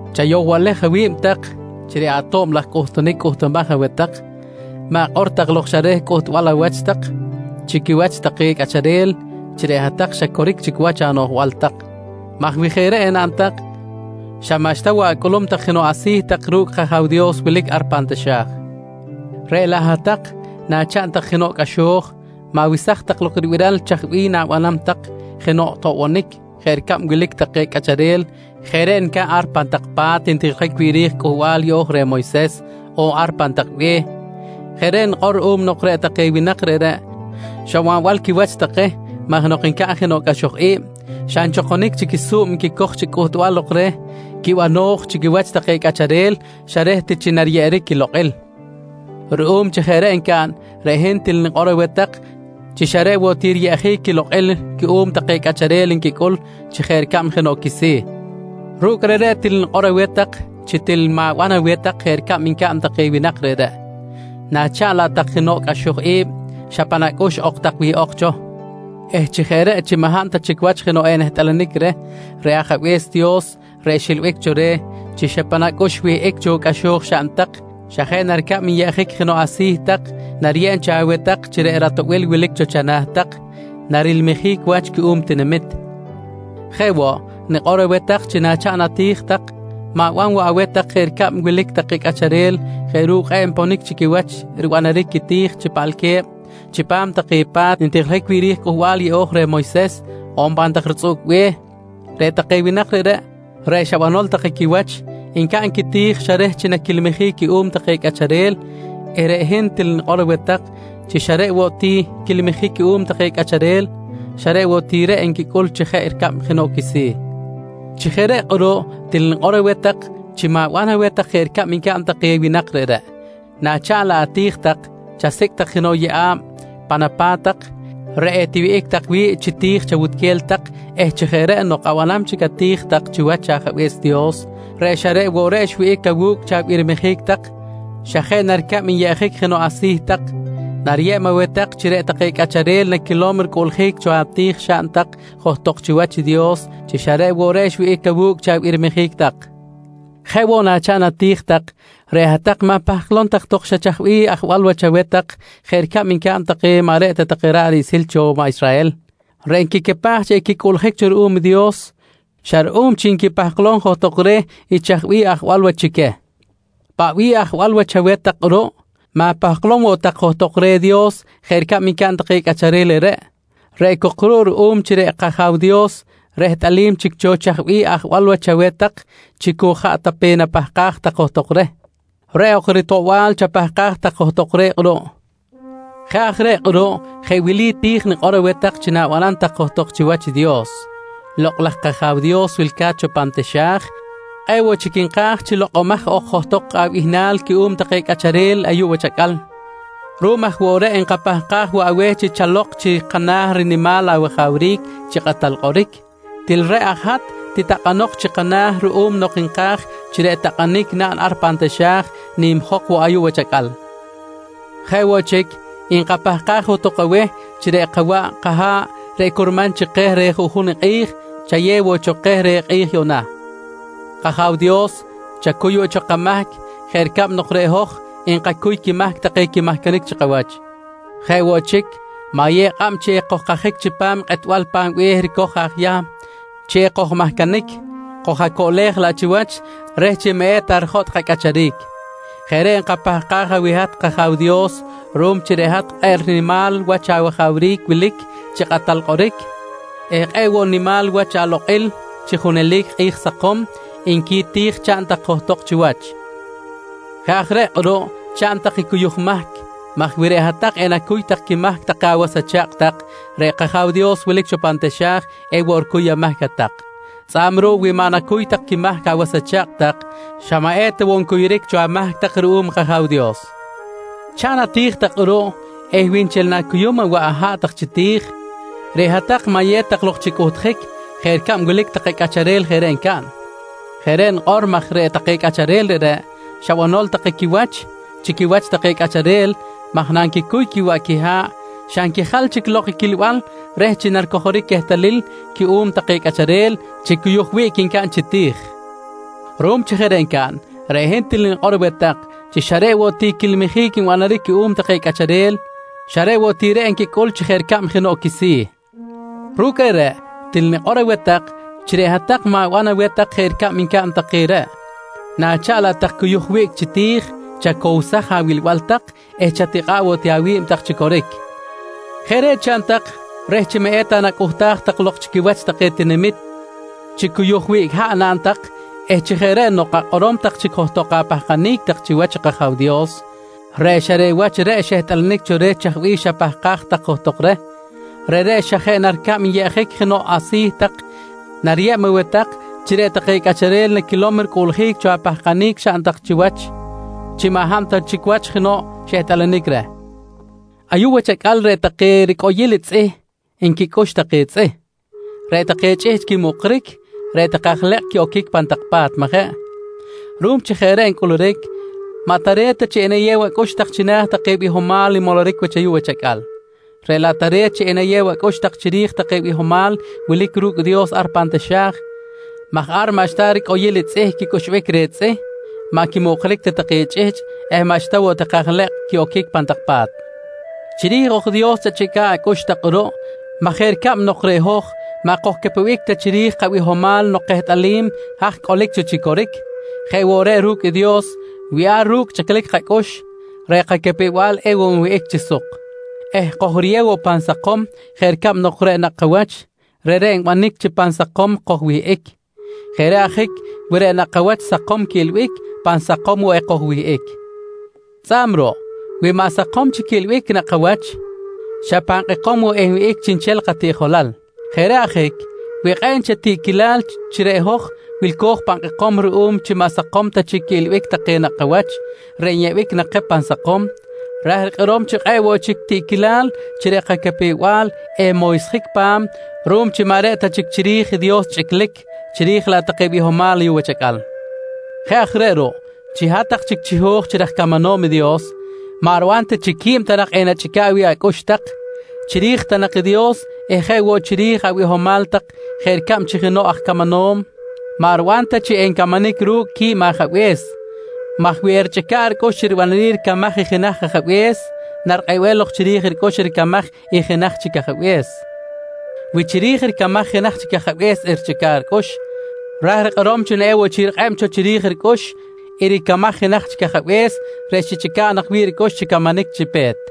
«Chayohbalej awi̱b tak chi reꞌ ato̱b laj cꞌuhtunic cꞌuhtumaj aweh tak, ma̱kꞌor tak lok xa reh cꞌuhtbal awach tak chi quiwach take cꞌacharel chi reꞌ hat-tak xa coric chic wach anoꞌjbal tak, maj wi jeꞌ reꞌ enaꞌn tak xa maꞌxta woꞌ acꞌulum tak jenoꞌ asi̱ tak ru̱cꞌ i kAja̱w Dios wilic ar pan taxa̱j. Reꞌ laꞌ hat-tak nachaꞌn tak jenoꞌ cꞌaxo̱j, ma̱wesaj tak lok ribiral chaj bih na̱banam tak jenoꞌ toꞌbonic jeꞌ ricab wilic take cꞌacharel jeꞌ reꞌ ncaꞌn ar pan tak pa̱t ntijiljic wi̱ꞌ ri̱j i Cꞌuhbal Yeꞌo̱j reh Moyses on ar pan tak be̱h. Jeꞌ reꞌ nikꞌor ruꞌum nok reꞌ take winak reꞌreꞌ xa banbal quiwach take maj nok ncaꞌn jenoꞌ cꞌaxoj i̱b xa nchokonic chic i su̱b nquicoj chi cꞌuhtbal lok reh quibano̱j chi quiwach take cꞌacharel xa reh ti chi nariyeꞌeric quilokꞌil. Ruꞌum chi jeꞌ reꞌ ncaꞌn, reꞌ hin til nikꞌor aweh tak chi xa reꞌ woꞌ ti riyeꞌjic quilokꞌil cuꞌum take cꞌacharel nquicꞌul chi jeꞌ ricab jenoꞌ quisi̱. Ru̱cꞌ reꞌreꞌ til nikꞌor woꞌ aweh tak chi til ma̱ban aweh tak jeꞌ ricab ncaꞌn take winak reꞌreꞌ, nachaꞌn laꞌ tak jenoꞌ cꞌaxoj i̱b, xa pan acꞌux ok tak wihꞌok cho eh chi jeꞌ reꞌ chi maꞌ hab ta chic wach jenoꞌ enehtꞌalanic reh, reꞌ Ajabe̱s Dios reꞌ xilbic cho reh chi xa pan acꞌux xwihꞌic i cꞌaxo̱j xaꞌn tak, xa jeꞌ na ricab nyeꞌjic jenoꞌ asi̱ tak, nariyeb cho aweh tak chi reꞌ ratoꞌbil wilic cho chana̱ tak, narilmijic wach cuꞌum i tinamit. «Jeꞌ woꞌ, nikꞌor aweh tak chi nachaꞌn ati̱j tak ma̱ban woꞌ aweh tak jeꞌ ricab wilic take cꞌacharel jeꞌ ru̱cꞌ kꞌe̱ꞌ nponic chi quiwach ribanaric quiti̱j chi paꞌalque̱b chipam take pa̱t ntijiljic wi̱ꞌ ri̱j i Cꞌuhbal Yeꞌo̱j reh Moyses on pan tak ritzꞌuꞌc be̱h. Reꞌ take winak reꞌreꞌ, reꞌ xa banbal take quiwach, ncaꞌn quiti̱j xa reh chi naquilmijic cuꞌum take cꞌacharel eh reꞌ hin til nikꞌor aweh tak chi xa reꞌ woꞌ ti quilmijic cuꞌum take cꞌacharel, xa reꞌ woꞌ ti reꞌ nquicꞌul chi jeꞌ ricab jenoꞌ quisi̱. Chi jeꞌ reꞌ kꞌuruꞌ, til nikꞌor woꞌ aweh tak chi ma̱ban aweh tak jeꞌ ricab ncaꞌn take winak reꞌreꞌ. Nachaꞌn laꞌ ati̱j tak, chasicꞌ tak jenoꞌ yeꞌa̱b pan apa̱t tak reꞌ etiwihꞌic tak wi̱ꞌ chi ti̱j chawutquel tak eh chi jeꞌ reꞌ nok abanam chic ati̱j tak chiwach Ajabe̱s Dios reꞌ xa reꞌ woꞌ reꞌ xwihꞌic awu̱cꞌ chi abirmajic tak, xa jeꞌ na ricab nyeꞌjic jenoꞌ asi̱ tak, nariyeb aweh tak chi reꞌ take cꞌacharel naquilom ricꞌuꞌljic cho ati̱j xaꞌn tak johtok chiwach i Dios chi xa reꞌ woꞌ reꞌ xwihꞌic awu̱cꞌ chi abirmajic tak. «Jeꞌ woꞌ nachaꞌn ati̱j tak, reꞌ hat-tak ma̱pahklom tak xa chaj bih ajwal wach chaweh tak jeꞌ ricab ncaꞌn take maꞌ reꞌ ta ra̱ꞌ riꞌsil cho maꞌ Israhel, reꞌ nquicapaj chi equicꞌuꞌljic cho ruꞌum i Dios xa ruꞌum chi nquipahklom johtok reh i chaj bih ajwal wach chi queh. Paꞌ bih ajwal wach chaweh tak kꞌuruꞌ, ma̱pahklom woꞌ tak johtok reh Dios jeꞌ ricab ncaꞌn take cꞌacharel reꞌreꞌ, reꞌ cok ruꞌ ruꞌum chi reꞌ kAja̱w Dios rehtꞌalim chic cho chaj bih ajwal wach chaweh tak chi cu jaꞌ ta pe napahkaj tak johtok reh, reꞌ ok ritoꞌbal chapahkaj tak johtok reh kꞌuruꞌ. Jeꞌ aj reꞌ kꞌuruꞌ je wili ti̱j nikꞌor aweh tak chi na̱banam tak johtok chiwach i Dios: ‹Lokꞌ laj kAja̱w Dios wilca̱t cho pan taxa̱j, kꞌe̱ꞌ woꞌ chic nka̱j chi lokꞌomaj ok johtok abihnal cuꞌum take cꞌacharel ayuꞌ wach acꞌal. Ruꞌum aj woꞌ reꞌ, nkapahkaj woꞌ aweh chi chalok chi kana̱ rinimal awajawric chi kꞌatal kꞌoric. Til reꞌ aj hat titakꞌanok chi kana̱ ruꞌum nok nka̱j chi reꞌ takꞌanic naꞌn ar pan taxa̱j nimjok woꞌ ayuꞌ wach acꞌal. Jeꞌ woꞌ chic, nkapahkaj johtok aweh chi reꞌ kawaꞌ kaha̱ꞌ reꞌ curman chi keh reh juꞌjun i kꞌi̱j, chayew woꞌ cho keh reh kꞌi̱j yuꞌna kAja̱w Dios, chacuy woꞌ cho kamahc jeꞌ ricab nok reꞌ hoj nkacuy quimahc take quimahcanic chi kawach. Jeꞌ woꞌ chic, ma̱yew kꞌab chi ekojkajic chipam kꞌetbal pa̱m be̱h ricoj aj Yahm chi ekojmahcanic, koj-acoꞌlej laꞌ chiwach, reh chi maꞌ eta rijotꞌ kacꞌacharic. Jeꞌ reꞌ nkapahkaj aweh hat kAja̱w Dios ruꞌum chi reꞌ hat kꞌe̱ꞌ rinimal wach awajawric wilic chi kꞌatal kꞌoric eh kꞌe̱ꞌ woꞌ nimal wach alokꞌil chi junelic kꞌi̱j sakom, nqui ti̱j chaꞌn tak johtok chiwach. «Jeꞌ aj reꞌ kꞌuruꞌ chaꞌn tak i cuyuj mahc maj wi reꞌ hat-tak enacuy tak quimahc take awas acha̱kꞌ tak, reꞌ kAja̱w Dios wilic cho pan taxa̱j ewoꞌ ricuy amahc hat-tak. Tzꞌa̱b ruꞌ wi maꞌ nacuy tak quimahc awas acha̱kꞌ tak, xa maꞌ eta woꞌ ncuyuric cho amahc tak ruꞌum i kAja̱w Dios. «Chaꞌn ati̱j tak kꞌuruꞌ eh wi nchel na̱cuyum awaꞌ aha̱ꞌ tak chi ti̱j, reꞌ hat-tak ma̱yew tak lok chi cꞌuhtjic jeꞌ ricab wilic take cꞌacharel jeꞌ reꞌ ncaꞌn. Jeꞌ reꞌ nikꞌor maj reꞌ take cꞌacharel reꞌreꞌ xa banol take quiwach chi quiwach take cꞌacharel maj nanquicuy quiwaꞌ quiha̱ꞌ xa nquijal chic lok i quilbal reh chi naricojoric quehtalil cuꞌum take cꞌacharel chi cuyuj wiꞌc ncaꞌn chi ti̱j. Ruꞌum chi jeꞌ reꞌ ncaꞌn, reꞌ hin til nikꞌor aweh tak chi xa reꞌ woꞌ ti quilmijic nbanaric cuꞌum take cꞌacharel, xa reꞌ woꞌ ti reꞌ nquicꞌul chi jeꞌ ricab jenoꞌ quisi̱. Ru̱cꞌ reꞌreꞌ til nikꞌor woꞌ aweh tak chi reꞌ hat-tak ma̱ban aweh tak jeꞌ ricab ncaꞌn take reꞌ, nachaꞌn laꞌ tak cuyuj wiꞌc chi ti̱j, chacowsaj awilbal tak eh chatikꞌa̱ꞌ woꞌ ti awi̱b tak chi coric. Jeꞌ reꞌ chaꞌn tak reh chi maꞌ eta nacꞌuhtaj tak lok chi quiwach take tinamit chi cuyuj wiꞌc haꞌ naꞌn tak eh chi jeꞌ reꞌ nok akꞌorom tak chic johtok apahkanic tak chiwach i kAja̱w Dios reꞌ xa reꞌ wach reꞌ xehtꞌalanic cho reh chaj bih xapahkaj tak johtok reh, reꞌreꞌ xa jeꞌ na ricab nyeꞌjic jenoꞌ asi̱ tak, nariyeb aweh tak chi reꞌ take cꞌacharel naquilom i ricꞌuꞌljic cho apahkanic xaꞌn tak chiwach chi maꞌ hab ta chic jenoꞌ xehtꞌalanic reh. «Ayuꞌ wach acꞌal reꞌ take ricꞌoyil tzꞌih nquicꞌux take tzꞌih, reꞌ take chꞌihchꞌ quimuꞌkric eh reꞌ take aj lekꞌ quiꞌoquic pan tak pa̱t, majeꞌ? Ruꞌum chi jeꞌ reꞌ ncꞌuluric, maꞌ tare̱t ta chi enayew acꞌux tak china̱ take bihomal nmoloric wach ayuꞌ wach acꞌal, reꞌ laꞌ tare̱t chi enayew acꞌux tak chiri̱j take bihomal wilic ru̱cꞌ Dios ar pan taxa̱j maj ar maꞌxta take ricꞌoyil tzꞌih quicꞌuxbic reh tzꞌih, maꞌ quimuꞌkric ta take chꞌihchꞌ eh maꞌxta woꞌ take aj lekꞌ quiꞌoquic pan tak pa̱t. Chiri̱j ok i Dios chachꞌica̱ꞌ tak acꞌux kꞌuruꞌ maj jeꞌ ricab nok reꞌ hoj maꞌ kojcapewenic ta chiri̱j kabihomal nok kehtꞌalim haj cꞌolic cho chi coric, jeꞌ woꞌ reꞌ ru̱cꞌ i Dios, wi ar ru̱cꞌ chꞌiclic kacꞌux, reꞌ kacapew-bal ewoꞌ nwihꞌic chi suk eh kojriyew woꞌ pan sakom jeꞌ ricab nok reꞌ nakꞌ kawach, reꞌreꞌ nbanic chi pan sakom kojwihꞌic. Jeꞌ reꞌ ajic wi reꞌ nakꞌ kawach sakom quiꞌilbic, pan sakom woꞌ ekojwihꞌic. Tzꞌa̱b ruꞌ, wi maꞌ sakom chic quiꞌilbic i nakꞌ kawach xa pan kꞌekom woꞌ enwihꞌic chiꞌnchel katiꞌjolal. Jeꞌ reꞌ ajic, wi kꞌe̱ꞌ nchel tiꞌquilal chi reꞌ hoj wilco̱j pan kꞌekom ruꞌum chi maꞌ sakom ta chic quiꞌilbic take nakꞌ kawach reꞌ nyeꞌbic nak keh pan sakom, ra̱j rikꞌorom chi kꞌe̱ꞌ woꞌ chic tiꞌquilal chi reꞌ kacapew-bal enmoysjic pa̱m ruꞌum chi maꞌ reꞌ ta chiri̱j i Dios chꞌiclic, chiri̱j laꞌ take bihomal ayuꞌ wach acꞌal. «Jeꞌ aj reꞌ ruꞌ, chi hat-tak chic chiho̱j chi raj camanom i Dios, maꞌ riban ta chi quib ta nak enachꞌica̱ꞌ wi̱ꞌ acꞌux tak, chiri̱j ta nak i Dios eh jeꞌ woꞌ chiri̱j abihomal tak jeꞌ ricab chi jenoꞌ aj camanom maꞌ riban ta chi encamanic ru̱cꞌ quib ajabe̱s maj wi erichꞌica̱ꞌ ricꞌux chi ribanaric ricamaj i jenaj ajabe̱s, narikꞌebem lok chiri̱j ricꞌux i ricamaj i jenaj chic ajabe̱s. Wi chiri̱j ricamaj i jenaj chic ajabe̱s erichꞌica̱ꞌ ricꞌux, ra̱j rikꞌorom chi ewoꞌ chic rikꞌeb cho chiri̱j ricꞌux i ricamaj i jenaj chic ajabe̱s reꞌ xichꞌica̱ꞌ nak wi̱ꞌ ricꞌux chi camanic chi pe̱t.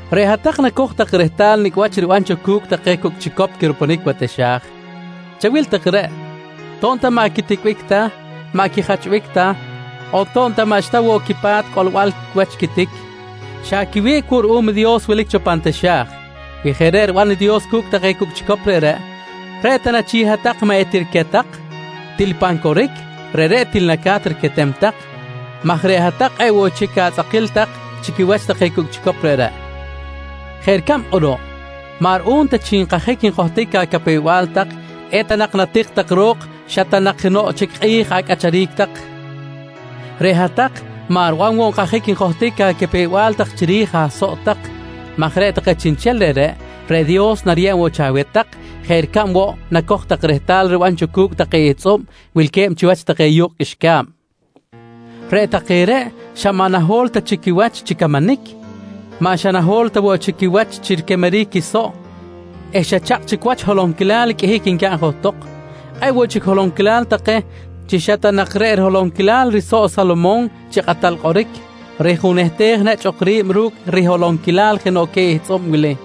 Reꞌ hat-tak nacoj tak rehtal nicꞌ wach riban cho cu̱cꞌ take cucꞌ chicop quirupunic wa taxa̱j. Chawil take reꞌ, to̱b ta maꞌ quiticbic ta, maꞌ quijachbic ta on to̱b ta maꞌxta woꞌ quipa̱t cꞌolbal wach i quitic, xa quiwiꞌc woꞌ ruꞌum i Dios wilic cho pan taxa̱j. Wi jeꞌ reꞌ riban i Dios cu̱cꞌ take chicop reꞌreꞌ, reꞌ ta na chic hat-tak maꞌ etiriquet tak? Til pan coric, reꞌreꞌ til naca̱t riquetem tak maj reꞌ hat-tak kꞌe̱ꞌ woꞌ chic atzꞌakil tak chi quiwach take chicop reꞌreꞌ. «Jeꞌ ricab kꞌuruꞌ, maꞌ ruꞌum ta chi nkajic njohtic acapew-bal tak, eta nak natik tak ro̱k xa ta nak jenoꞌ chic kꞌi̱j acꞌacharic tak, reꞌ hat-tak maꞌ riban woꞌ chi nkajic njohtic acapew-bal tak chiri̱j asoꞌ tak maj reꞌ take chiꞌnchel reꞌreꞌ, reꞌ Dios nariyeb cho aweh tak jeꞌ ricab woꞌ nacoj tak rehtal riban cho cu̱cꞌ take ihtzꞌub wilque̱b chiwach take yu̱kꞌ qꞌuixca̱b. Reꞌ take reꞌ xa maꞌ naho̱l ta chic quiwach chi camanic, maꞌ xa naho̱l ta woꞌ chic quiwach chi riquemeric quisoꞌ eh xa chakꞌ chic wach holonquilal qꞌuihic ncaꞌn tok. Kꞌe̱ꞌ woꞌ chic holonquilal take, chi xa ta nak reꞌ riholonquilal risoꞌ i Salomon chi kꞌatal kꞌoric rijunehtej nechꞌ ok ri̱b ru̱cꞌ riholonquilal jenoꞌ queh ihtzꞌub wili!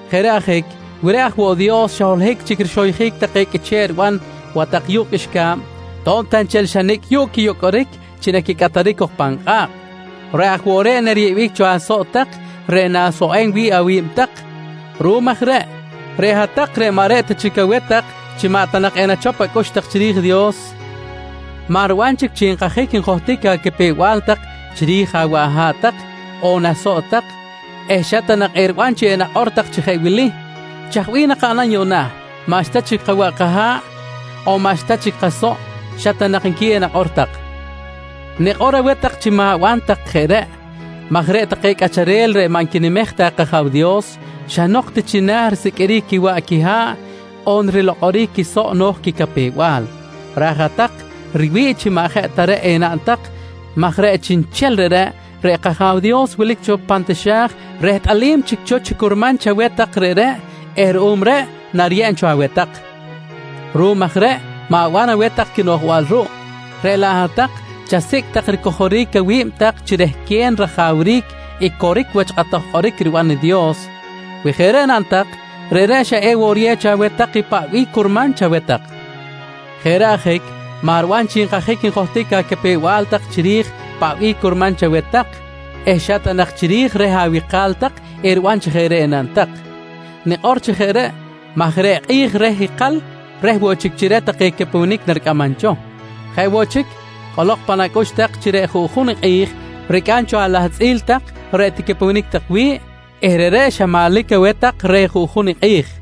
Jeꞌ reꞌ ajic, wi reꞌ aj woꞌ Dios xa holohic chic rixoyjic take qꞌuiche̱ꞌ riban watak yu̱kꞌ qꞌuixca̱b to̱b ta nchel xa nicꞌ yuꞌ quiyocꞌoric chi naquicꞌataric cok pan kꞌa̱kꞌ, reꞌ aj woꞌ reꞌ nariyeꞌbic cho asoꞌ tak reꞌ na̱soꞌem wi̱ꞌ awi̱b tak. Ruꞌum aj reꞌ, reꞌ hat-tak reꞌ maꞌ reꞌ ta chic aweh tak chi maꞌ ta nak enachop acꞌux tak chiri̱j i Dios, maꞌ riban chic chi nkajic njohtic acapew-bal tak chiri̱j awaꞌ aha̱ꞌ tak on asoꞌ tak eh xa ta nak eriban chi enakꞌor tak chi jeꞌ wili: ‹Chaj bih nakaꞌnam yuꞌna? maꞌxta chic kawaꞌ kaha̱ꞌ on maꞌxta chic kasoꞌ, xa ta nak nqui enakꞌor tak. «Nikꞌor aweh tak chi ma̱ban tak jeꞌ reꞌ maj reꞌ take cꞌacharel reꞌ maꞌ nquinimej ta i kAja̱w Dios, xa nok ti china̱ risiqꞌuiric quiwaꞌ quiha̱ꞌ on rilokꞌoric quisoꞌ no̱j quicapew-bal. Ra̱j hat-tak riwi̱ꞌ chi maꞌ jeꞌ ta reꞌ enaꞌn tak maj reꞌ chiꞌnchel reꞌreꞌ, reꞌ kAja̱w Dios wilic cho pan taxa̱j rehtꞌalim chic cho chi curman chaweh tak reꞌreꞌ eh ruꞌum reꞌ nariyeb cho aweh tak. Ruꞌum aj reꞌ ma̱ban aweh tak i quinoꞌjbal ruꞌ, reꞌ laꞌ hat-tak chasicꞌ tak ricojoric awi̱b tak chi rehquen rajawric i coric wach kꞌatoj kꞌoric riban i Dios. Wi jeꞌ reꞌ naꞌn tak, reꞌreꞌ xa ewoꞌ riyew cho aweh tak i paꞌ bih curman chaweh tak. Jeꞌ reꞌ ajic, maꞌ riban chi nkajic njohtic acapew-bal tak chiri̱j paꞌ bih curman chaweh tak eh xa ta nak chiri̱j reh awika̱l tak eriban chi jeꞌ reꞌ enaꞌn tak. Nikꞌor chi jeꞌ reꞌ maj reꞌ kꞌi̱j reh ikal reh woꞌ chic chi reh take capewenic naricꞌamam cho. Jeꞌ woꞌ chic, cꞌolok pan acꞌux tak chi reꞌ juꞌjun i kꞌi̱j ricꞌam cho alahtzꞌil tak reꞌ ticapewenic tak wi̱ꞌ eh reꞌreꞌ xa manlic aweh tak reh juꞌjun i kꞌi̱j.